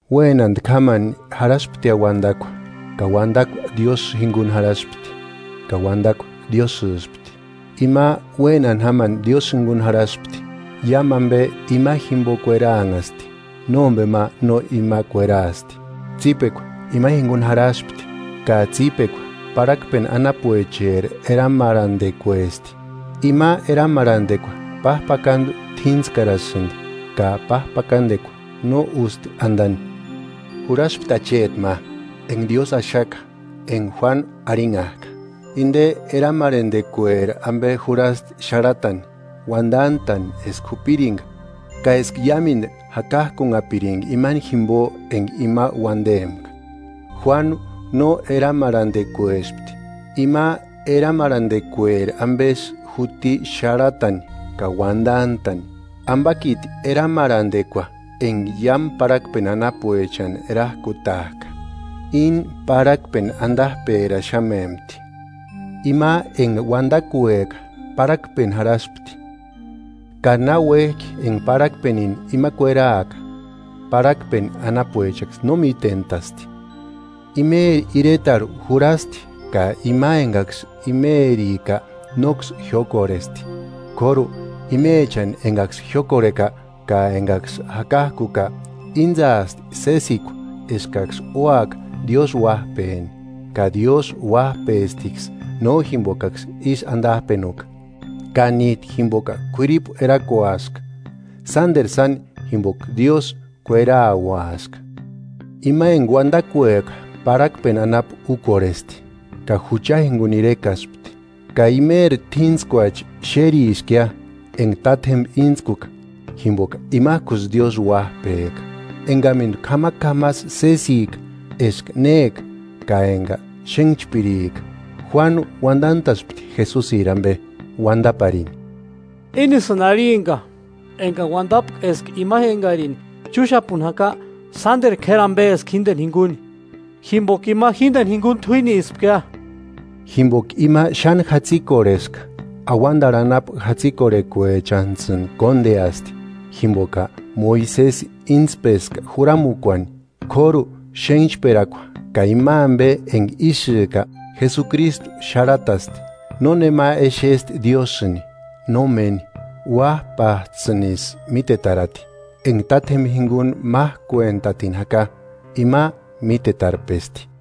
Uénantki jámani jarhasptia Uandakua, ka Uandakua Diósï jinguni jarhaspti, ka Uandakua Diósïspti. Ima, uénani jámani Diósï jinguni jarhaspti. Iámu ambe ima jimbo kueraanhasti; nómbema no ima kueraasti. Tsípekua ima jinguni jarhaspti, ka tsípekua parhakpeni anapuecheri eramarhandekuesti. Ima eramarhandekua pájpakandu t'íntskarasïndi ka pájpakandekua no ústi andani. Jurhaspti acheti ma, enga Diósï axaka, enga Juánu arhinhajka. Inde eramarhandekueri ambe jurhasti xarhatani, uandantani eska jupiringa, ka eska iámendu jakajkunhapiringa imani jimbo enga ima uandempka. Juánu no eramarhandekuespti, ima eramarhandekueri ambesï juti xarhatani ka uandantani. Ambakiti eramarhandekua enga iámu parhakpeni anapuechani erajkutajka, íni parhakpeni andajperaxamempti. Ima enga Uandakueka parhakpeni jarhaspti, ka náuejki enga parhakpenini ima kueraaka, parhakpeni anapuechaksï no mítentasti. Imeri iretarhu jurhasti ka ima engaksï imerika nóksï jiókorhesti. K'óru, imechani engaksï jiókorheka ka engaksï jakakuka, íntsaasti sésekua eskaksï úaka Diósï uájpeni. Ka Diósï uájpestiksï, no jimbokaksï ísï andajpenuka, ka níjtu jimboka k'uiripu erakuaska, sánderu sáni, jimboka Diósï kuerauaska. Ima enga Uandakueka parhakpeni anapu úkorhesti ka jucha jinguni irekaspti. Ka imeri t'íntskuachi xériskia, enga tátjemba íntskuka, jimboka imajkusï Diósï Uájpeka, engamendu k'amak'amasï sésika eska néka ka enga xénhchpirika. Juánu uandantaspti Jesusiri ambe, uandaparini: “Ínisïni arhimpka engani uandapka eska ima engarini chúxapuni jaka sánderu k'éri ambeska jíndeni jinguni, jimboka ima jíndeni jinguni t'uínispkia.” Jimboka ima xáni jatsïkorheska, auandarhu anapu jatsikorhekuechantsïni kóndeasti; jimboka Moisesi íntspeska juramukuani, k'óru, xénhchperakua ka ima ambe enga ísïka Jesukristu xárhatasti. Nónema exesti Diósïni, nómeni; Uájpajtsïnisï mítetarati, enga Tátjemba jinguni májkuentatini jaka, Ima mítetarpesti.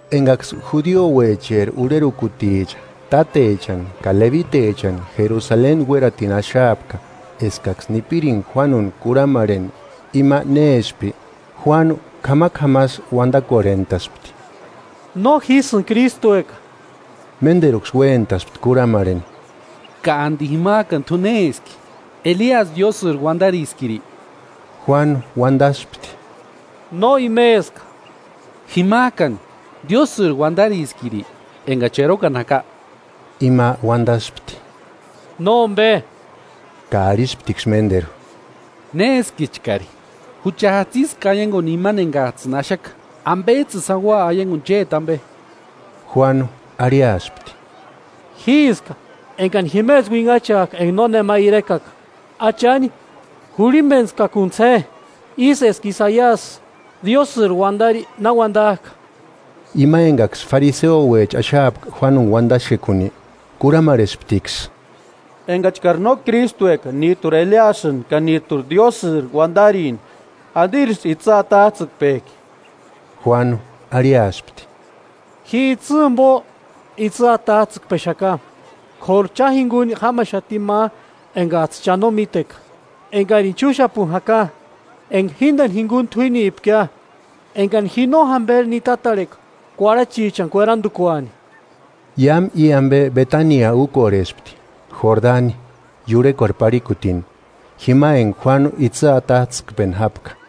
Engaksï judiouecheri urherukuticha, tátechani ka lebitechani Jerusaleni uératini axaapka, eskaksï nipiringa Juánuni kurhamarheni ima néspki, Juánu k'amak'amasï uandakorhentaspti. –No jísïni Krístueka. Ménderuksï uéntaspti kurhamarheni: –¿Ka andi jimajkani t'u néski? ¿Eliasï Diósïri uandariskiri? Juánu uandaspti: –No imeska. –Jimajkani, ¿Diósïri uandariskiri engachi erokani jaka? Ima uandaspti: –Nómbe. Ka arhisptiksï ménderu: –¿Néskichkari? Jucha jatsiska aianguani imani engajtsïni axaka. ¿Ambejtsïni sáni ua aianguni chéti ambe? Juánu arhiaspti: –Jíska engani jimesï uinhachajka enga nónema irekaka: Achani jurhimbentskakuntsï je, ísï eska Isaiasï Diósïri uandari na uandajka. Ima engaksï fariseouecha axaapka Juánuni uandaxekuni, kurhamarhesptiksï: –Engachkari no Krístueka, níjturi Eliasïni, ka níjturi Diósïri uandarini, ¿Andirisï itsï atajtsïkpejki? Juánu arhiaspti: –Ji itsï jimbo itsï atajtsïkpexaka; k'óru cha jinguni jámaxati ma engajtsï cha no míteka engarini chúxapuni jaka, enga jíndeni jinguni t'uínipkia, engani ji no jamberini nitatarheka kuarhachichani kuerandukuani. Iámu i ambe Betania úkorhespti, Jordani iurhekuarhu parhikutini, jima enga Juánu itsï atajtsïkpeni jápka.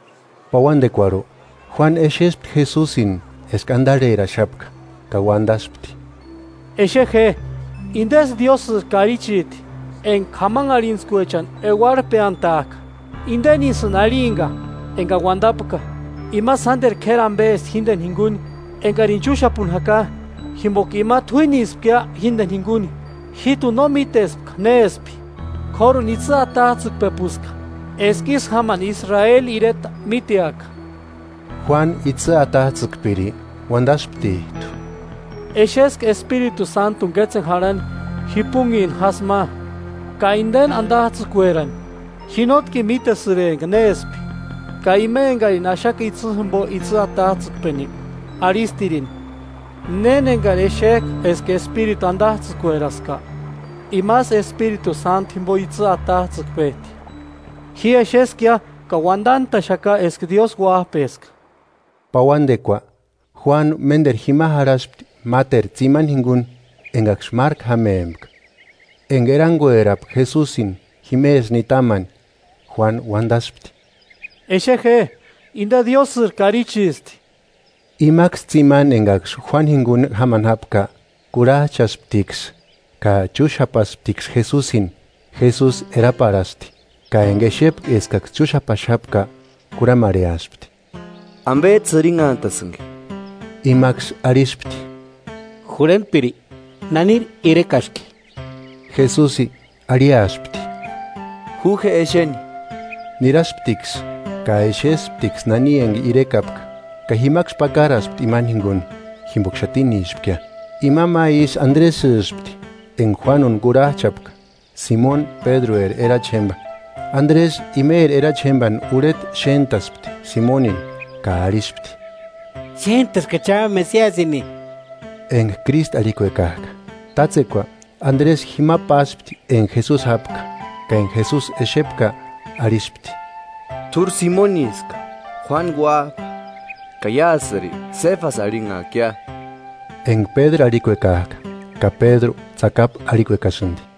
Pauandekuarhu, Juánu exespti Jesusini eska andarheraxapka, ka uandaspti: “¡Exe je, indesï Diósïri Karichiti, enga k'amanharhintskuechani euarhpeantajka! Indenisïni arhimpka engani uandapka: ‘Ima sánderu k'éri ambesti jíndeni jinguni engarini chúxapuni jaka, jimboka ima t'uínispkia jíndeni jinguni. Jíjtuni no mítespka néspki; k'óruni itsï atajtsïkpepuska, eska ísï jámani Israeli ireta míteaka.’” Juánu itsï atajtsïkpiri uandasptijtu: “Exeska Espiritu Sántuni kétseni jarhani jipunhini jásï ma, ka indeni andajtsïkuerani. Ji nótkini mítesïrempka néspki; ka ima engarini axaka itsï jimbo itsï atajtsïkpeni, arhistirini: ‘Néni engari exejka eska Espiritu andajtsïkueraska imasï Espiritu Sántuni jimbo itsï atajtsïkpejti.’ Ji exeskia ka uandantaxaka eska Diósï uájpeska.” Pauandekua, Juánu ménderu jima jarhaspti, máteru tsimani jinguni, engaksï márku jámempka. Enga eranguerapka Jesusini jimesï nitamani, Juánu uandaspti: –¡Exe je, inde Diósïri Karichisti! Imaksï tsimani engaksï Juánu jinguni jámani jápka, kurhajchasptiksï ka chúxapasptiksï Jesusini. Jesusi eraparhasti, ka enga exepka eskaksï chúxapaxapka kurhamarheaspti: –¿Ambejtsï jirinhantasïnki? Imaksï arhispti: –Jurhentpiri, ¿Naniri irekaski? Jesusi arhiaspti: –Ju je exeni. Nirasptiksï, ka exesptiksï nani enga irekapka, ka jimaksï pakaraspti imani jinguni, jimboka xatinispkia. Ima ma isï Andresïspti, enga Juánuni kurhajchapka, Simoni Pédrueri erachi jémba. Andresï imeri erachi jémbani urheta xéntaspti, Simonini, ka arhispti: –Xéntaskachia Mesiasini, (enga Krístu, arhikuekajka.) Tátsekua Andresï jima páspti enga Jesusi jápka; ka enga Jesusi exepka, arhispti: –T'úri Simoniska, Juánu uájpa, ka iásïri Séfasi arhinhaakia (enga Pédru arhikuekajka, ka Pédru tsakapu arhikuekasïndi).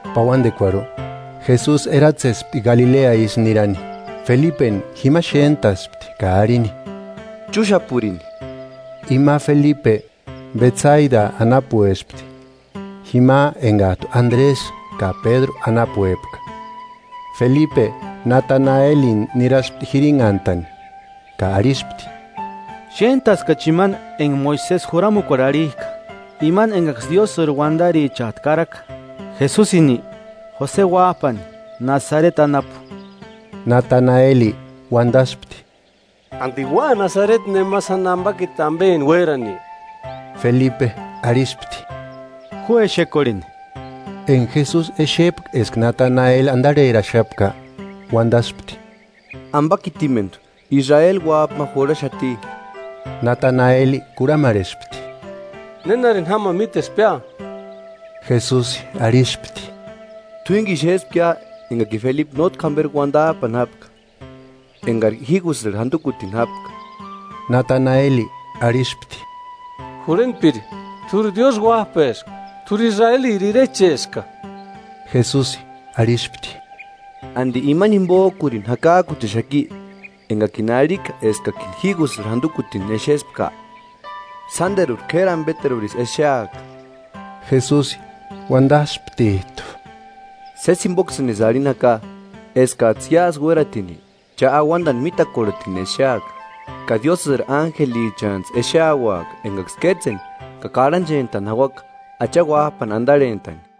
Pauandekuarhu, Jesusi eratsespti Galilea isï nirani. Felipeni jima xéntaspti ka arhini: –Chúxapurini. Ima Felipe, Betsaida anapuespti, jima engajtu Andresï ka Pédru anapuepka. Felipe, Natanaelini niraspti jirinhantani, ka arhispti: –Xéntaskachi imani enga Moisesi juramukuarhu arhijka, imani engaksï Diósïri uandarichajtu karaka. Jesusini, Jose uájpani, Nasareti anapu. Natanaeli uandaspti: –¿Andi ua Nasareti nema sáni ambakiti ambeni uérani? Felipe arhispti: –Ju exekorheni. Enga Jesusi exepka eska Natanaeli andarheraxapka, uandaspti: –Ambakitimendu Israeli uájpa ma jurhaxati. Natanaeli kurhamarhespti: –¿Nénarini jámani mítespkia? Jesusi arhispti: –T'uínkini xéspkia engakini Felipe nótki jamberi uandajpani jápka, engari jígusïrhu jandukutini jápka. Nataneli arhispti: –Jurhentpiri, ¡T'úri Diósï Uájpeska, t'úri Israeliri Irecheska! Jesusi arhispti: –¿Andi imani jimbojkurini jakajkuchexaki engakini arhika eskakini jígusïrhu jandukutini exespka? Sánderuri k'éri ambeterurisï exeaka. Jesusi uandasptijtu: –Sési jimboksïnisï arhini jaka, eskajtsï iásï uératini cha auandani mítakorhetini exeaka, ka Diósïri ánjelichantsï exeauaka engaksï kétseni ka karhanchentani jauaka Acha Uájpani andarhentani.